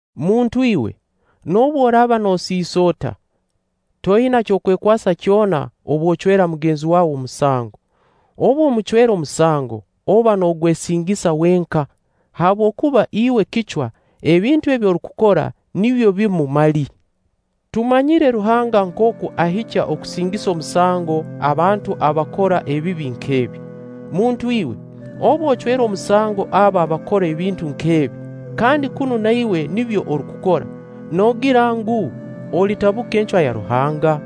Muntu iwe, noobu oraaba noosisa ota, toina ky'okwekwasa kyona obu ocwera mugenzi waawe omusango. Obu omucwera omusango, oba noogwesingisa wenka, habwokuba iwe kicwa, ebintu ebi orukukora nibyo bimu mali. Tumanyire Ruhanga nkooku ahikya okusingisa omusango abantu abakora ebibi nk'ebi. Muntu iwe, obu ocwera omusango abo abakora ebintu nk'ebi, kandi kunu na iwe nibyo orukukora, noogira ngu, olitabuka encwa ya Ruhanga?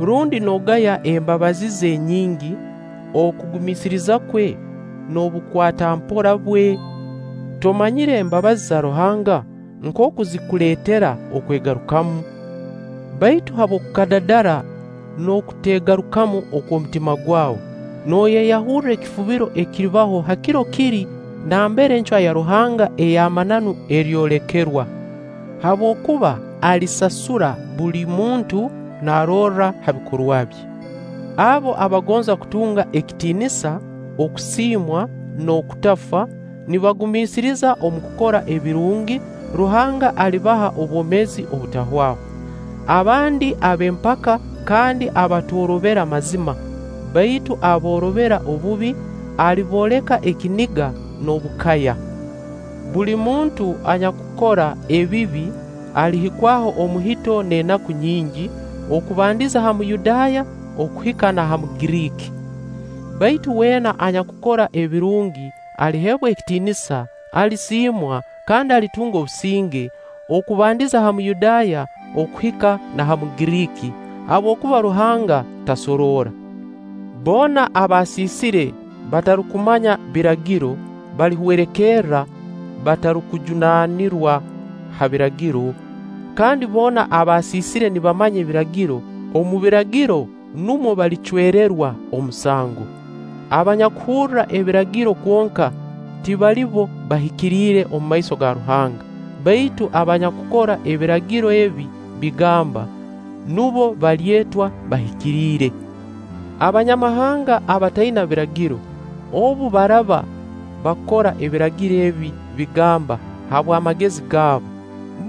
Rundi noogaya embabazi ze enyingi, okugumiisiriza kwe n'obukwata-mpora bwe? Tomanyire embabazi za Ruhanga nkooku zikuleetera okwegarukamu? Baitu habw'okukadadara n'okuteegarukamu okw'omutima gwawe, nooyeyahurra ekifubiro ekiribaho ha kiro kiri, nambere encwa ya Ruhanga ey'amananu eryolekerwa. Habwokuba alisasura buli muntu naarorra ha bikorwa bye. Abo abagonza kutunga ekitiinisa, okusiimwa, n'okutafa, nibagumiisiriza omu kukora ebirungi, Ruhanga alibaha obwomeezi obutahwaho. Abandi ab'empaka kandi abatoorobera mazima, baitu aboorobera obubi, alibooleka ekiniga n'obukaya. Buli muntu anyakukora ebibi alihikwaho omuhito n'enaku nyingi, okubandiza ha Muyudaaya okuhika na ha Mugiriiki. Baitu weena anyakukora ebirungi aliheebwa ekitiinisa, alisiimwa, kandi alitunga obusinge, okubandiza ha Muyudaaya okuhika na ha Mugiriiki, habwokuba Ruhanga tasoroora. Boona abasiisire batarukumanya Biragiro, balihwerekerra batarukujunaanirwa ha Biragiro. Kandi boona abaasiisire nibamanya Ebiragiro, omu Biragiro numwo balicwererwa omusango. Abanyakuhurra Ebiragiro kwonka, tibali bo bahikiriire omumaiso go Ruhanga, baitu abanyakukora Ebiragiro ebi bigamba, nubo balyetwa bahikiriire. Abanyamahanga abataina Biragiro, obu baraaba bakora Ebiragiro ebi bigamba habw'amagezi gaabo,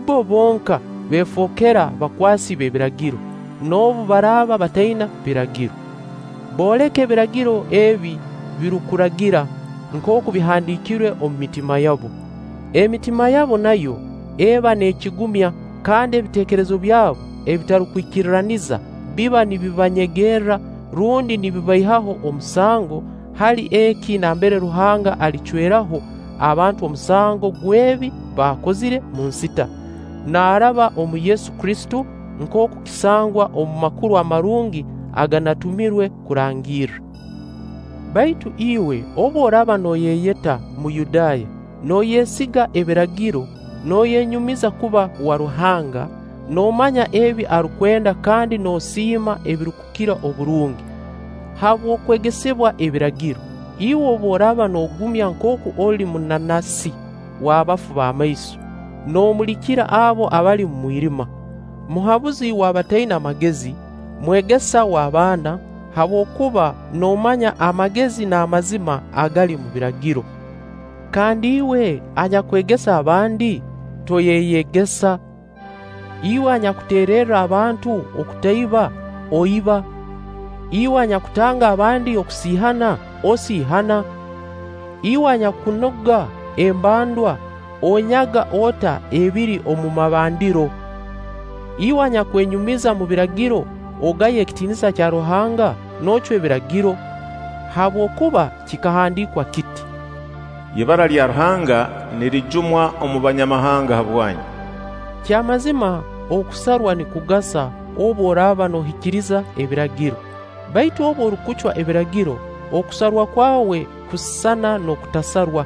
bbo bonka beefookera bakwasi b'Ebiragiro, noobu baraaba bataina Biragiro. Booleka Ebiragiro ebi birukuragira nkooku bihandiikirwe omu mitima yabo. Emitima yabo nayo eba neekigumya, kandi ebiteekerezo byabo ebitarukwikirraniza biba nibibanyegerra rundi nibibaihaho omusango ha kiro eki nambere Ruhanga alicwerraho abantu omusango gw'ebi baakozire omu nsita, naaraba omu Kristo Yesu, nkooku kisangwa omu Makuru Amarungi aganatumirwe kurangirra. Baitu iwe obu oraaba nooyeyeta Muyudaaya, nooyesiga Ebiragiro nooyenyumiza kuba wa Ruhanga noomanya ebi arukwenda kandi noosiima ebirukukira oburungi, habw'okwegesibwa Ebiragiro, iwe obu oraaba noogumya nkooku oli munanasi w'abafu b'amaiso, noomulikira abo abali omu mwirima, muhabuzi w'abataina magezi, mwegesa w'abaana, habwokuba noomanya amagezi n'amazima agali omu Biragiro, - kandi iwe anyakwegesa abandi, toyeyegesa? Iwe anyakuteererra abantu okutaiba, oiba? Iwe anyakutanga abandi kusiihana, osiihana? Iwe anyakunuga embandwa, onyaga ota ebiri omu mabandiro? Iwe anyakwenyumiriza omu Biragiro, ogaya ekitiinisa kya Ruhanga noocwa Ebiragiro? Habwokuba kikahandiikwa kiti: “Ibara lya Ruhanga nirijumwa omu Banyamahanga habwanyu.” Kyamazima okusarwa nikugasa obu oraaba noohikiriza Ebiragiro; baitu obu orukucwa Ebiragiro, okusarwa kwawe kusisana n'okutasarwa.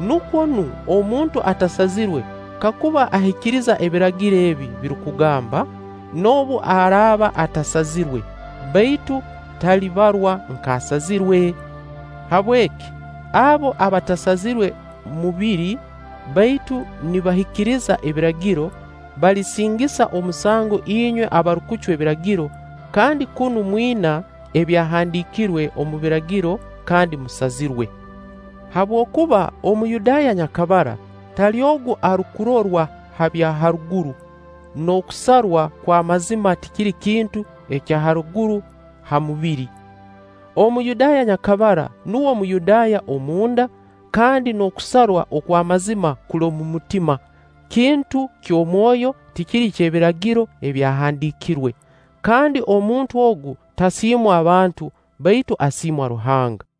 Nukwo nu omuntu atasazirwe, kakuba ahikiriza Ebiragiro ebi birukugamba, noobu araaba atasazirwe, baitu talibarwa nk'asazirwe? Habweki, abo abatasazirwe mubiri baitu nibahikiriza Ebiragiro, balisingisa omusango inywe abarukucwa Ebiragiro kandi kunu mwina ebyahandiikirwe omu Biragiro kandi musazirwe. Habwokuba Omuyudaaya nyakabara tali ogu arukurorwa ha bya haruguru, n'okusarwa kw'amazima tikiri kintu kya haruguru ha mubiri. Omuyudaaya nyakabara nuwe Muyudaaya omunda; kandi n'okusarwa okw'amazima kuli omu mutima, kintu ky'omwoyo tikiri ky'Ebiragiro ebyahandiikirwe. Kandi omuntu ogu tasiimwa abantu, baitu asiimwa Ruhanga.